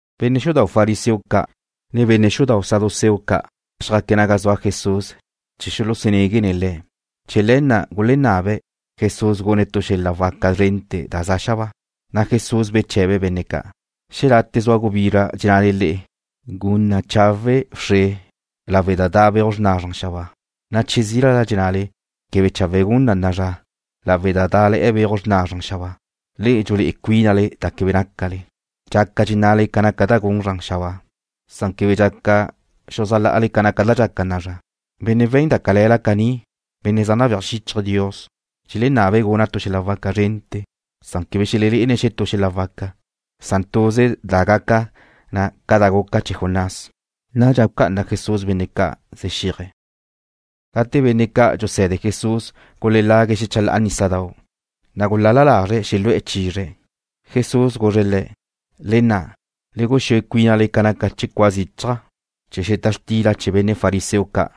Benne' xudau' fariseo ca', ne benne' xudau' saduceo ca' xjaque̱' naga zua Jesús chee̱ xuluxunéguene̱' Le̱'. Chee̱ le̱ na' gulenabe̱' Jesús gune̱' tu xel-la' waca zrente̱ da za xabáa. Jesús beche̱be̱' benne' ca': ―Xelate' zua gubizra dxennale le'e: “Gun chawe' wxre lawe' da da' beuj xrna zran xabáa.” Che zílala dxennale: “Quebe chawe' gun na'a zra lawe' da dá'le̱'e̱ beuj xrna zran xabáa.” Le'e dxulé'e cuínale da quebe nácale. Dxácaqueze dxennale ca naca da gun zran xabáa. Quebe dxaca xuzájla'ale ca sa'yeaj da dxaca na'a zra. Benne' we̱n da cale̱la caní, benne' zaj nabéaj xíchaje̱' Dios, dxelenabe̱' guna' tu xel-la' waca zrente̱. Quebe xelelé'ene̱' xetú xel-la' waca. Welelé'ene̱' tuze da gaca na ca da guca chee̱ Jonás. Nadxa bulucá'ana Jesús benne' ca', zjá'aque̱'. Gate benne' ca' dxuse̱de Jesús guladée̱' xechalá'a nísadau', na' gulal-la lazre̱' xelu'e̱ chizre̱'. Jesús guzre̱' le̱': ―Le nna'xque. Le guxúe cuínale ca naca chee̱ cua zichaj chee̱ xeta xtila chee̱ benne' fariseo ca',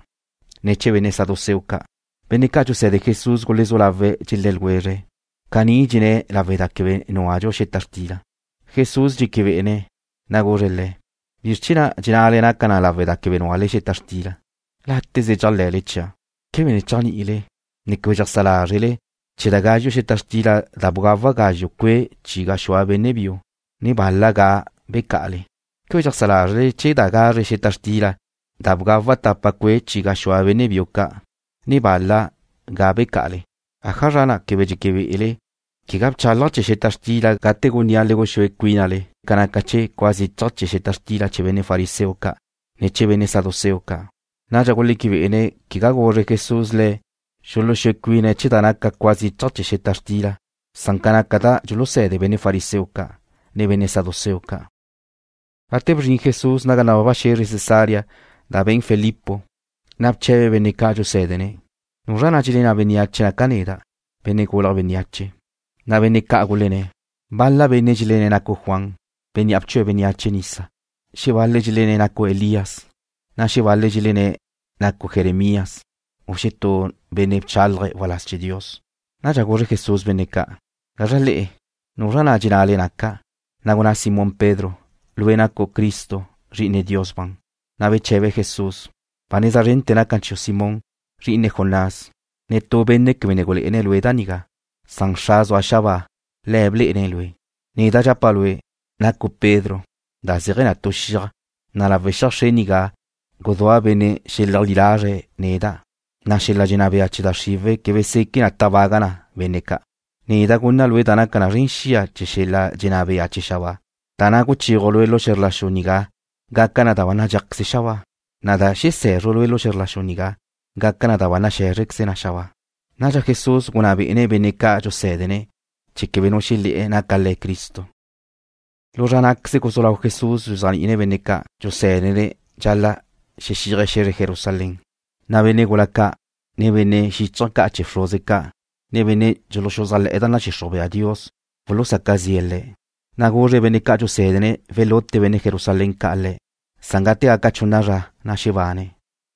ne chee̱ benne' saduceo ca'. Benne' ca' dxuse̱de Jesús gulezú lawe̱' dxelé̱ ljwezre̱': ―Caní dxenné̱' lawe' da quebe núadxu xeta xtila. Jesús dxeque be'ene̱', na' guzre̱' le̱': ―¿Bizr chee̱ na' dxennale naca na lawe' da quebe núale xeta xtila? Láteze dxéajle̱le chia'. ¿Quebe ne chéajni'ile, ne quebe dxeajsá lázrele chee̱ da gazxu' xeta xtila da bgawa' gazxu' cue' chi gaxúa benne' biu, ne bal-la ga' becá'ale? ¿Quebe dxeajsá lázrele chee̱ da gazre xeta xtila da bgawa' tapa cue' chi gaxúa benne' biu ca', ne bal-la ga' becá'ale? ¿Ájazra na' quebe dxeque be'ele quegá bchálaja' chee̱ xeta xtila gate gunnía' le guxúe cuínale ca naca chee̱ cua zichaj chee̱ xeta xtila chee̱ benne' fariseo ca', ne chee̱ benne' saduceo ca'? Nadxa guleque bé'ene̱' quegá guzre Jesús le̱' xuluxúe cuine̱' chee̱ da naca cua zichaj chee̱ xeta xtila, san ca naca da dxuluse̱de benne' fariseo ca', ne benne' saduceo ca'. Gate bzrin Jesús naga nababa xe̱zre Cesarea da be̱n Filipo, na' bche̱be̱' benne' ca' dxusé̱dene̱': ―¿Nuzra na' dxelenná bénneache naca' neda', Benne' Gulje̱' Bénneache? Na' benne' ca' gulenné̱': ―Bal-la benne' dxelenné̱' nacu' Juan, bénnea' bchue̱' bénneache nisa. Xebal-le̱' dxelenné̱' nacu' Elías, na' xebal-le̱' dxelennáqueze̱' nacu' Jeremías, u xetú benne' bchálaje̱' waláz chee̱ Dios. Nadxa guzre Jesús benne' ca': ―¿Gazra le'e? ¿Nuzra na' dxennale naca'? Gunná Simón Pedro: ―Lue' nacu' Cristo, Zri'ine Dios ban. Beche̱be Jesús: ―Ba neza zren naca na chiu' Simón, zri'ine Jonás. Netú benne' quebe ne gulé'ene̱' lue' da nigá, san Xra' zua xabáa, Le̱' blé'ene̱' lue'. Neda' dxapa' lue', nacu' Pedro, da zéaje̱ na tu xiaj, na' lawe' xiaj xre nigá guzúa' benne' xeleajlí lazre̱' neda', na' xel-la' dxenná bea chee̱ da xriwe̱' quebe seque na gucu'uj na benne' ca'. Neda' gunna' lue' da naca na zren xia chee̱ xel-la' dxenná bea chee̱ xabáa, na' da guchéaju' lue' lu xe̱zr la xu nigá gaca na da ba nadxéajqueze na xabáa, na' da xese̱zru' lue' lu xe̱zr la xu nigá gaca na da ba naxé̱zrequeze na xabáa. Nadxa Jesús gunná bé'ene̱' benne' ca' dxusé̱dene̱' chee̱ quebe nu xelé̱'e̱ naca Le̱' Cristo. Lu zra ná'queze guzú lau Jesús dxuzéajni'ine̱' benne' ca' dxusé̱dene̱' dxal-la' xexíaje̱' xe̱zre Jerusalén, na' benne' gula ca', ne benne' xíchaje̱ ca' chee̱ bxruze ca', ne benne' dxuluxuzájle̱'e̱ da nadxixruj bea Dios wulusaca zi'e̱ Le̱'. Na' guzre̱' benne' ca' dxusé̱dene̱' welute benne' Jerusalén ca' Le̱'. Nadxa gate gaca chunna zra xebane̱'.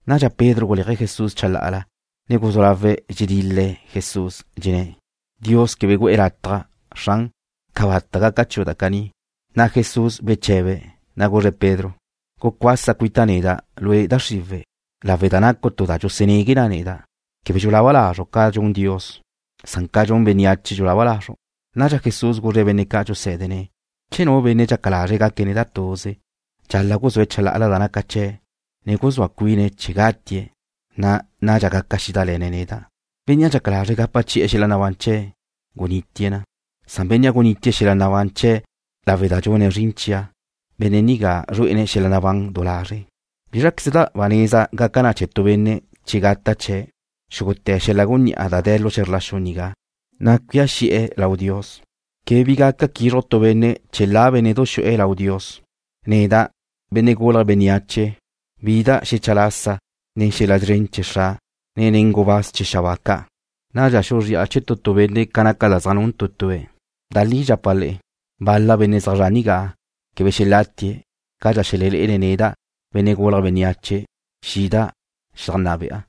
Nadxa Pedro guléaje̱' Jesús chalá'ala, ne guzú lawe̱' dxedil-le̱' Le̱', dxenné̱': ―Dios quebe gu'e̱ lataj, Xran. Cabata' gaca chiu' da caní. Jesús bexéchaje̱', na' guzre̱' Pedro: ―Gucuasa cuita' neda', lue', da xriwe̱', lawe' da nacu' tu da dxusunegue na neda'. Quebe dxulaba lazru' ca dxun Dios. Ca dxun bénneache dxulaba lazru'. Nadxa Jesús guzre̱' benne' ca' dxusé̱dene̱': ―Che nu benne' dxaca lazre̱' gaque̱' neda' tuze, dxal-la' guzúe̱' chalá'ala da naca chee̱', ne guzúa cuine̱' chee̱ gatie̱', na' nadxa gaca xídale̱ne̱' neda'. Bénnea' dxaca lazre̱' gapa chi'e̱ xel-la' nabán chee̱' gunitie̱' na. Bénnea' gunitie̱' xel-la' nabán chee̱' lawe' da dxune̱' zrin chia', benne' nigá zrué'ene̱' xel-la' nabán du lazre'. ¿Bízraqueze ba neza naca na chee̱ tu benne' che gata' chee̱' xúgute̱ xel-la' gunní'a da de̱ lu xe̱zr la xu nigá, na' cuía xi'e̱ lau Dios? Quebe bi gaca quizruj tu benne' chee̱ la bénne'du xu'e lau Dios. Neda', Benne' Gulje̱' Bénneache wida' xecha lasa nen xel-la' szren chee̱ Xra', ne nen gubáz chee̱ xabáa ca'. Nadxa xuzría chee̱ tu tu benne' ca naca da zaj nun tu tue̱'. Da li dxapa' le'e, bal-la benne' zaj zre̱'e̱ nigá quebe xelatie̱' cadxa xelelé'ene̱' neda', Benne' Gulje̱' Bénneache, xida' xedajnná be'a.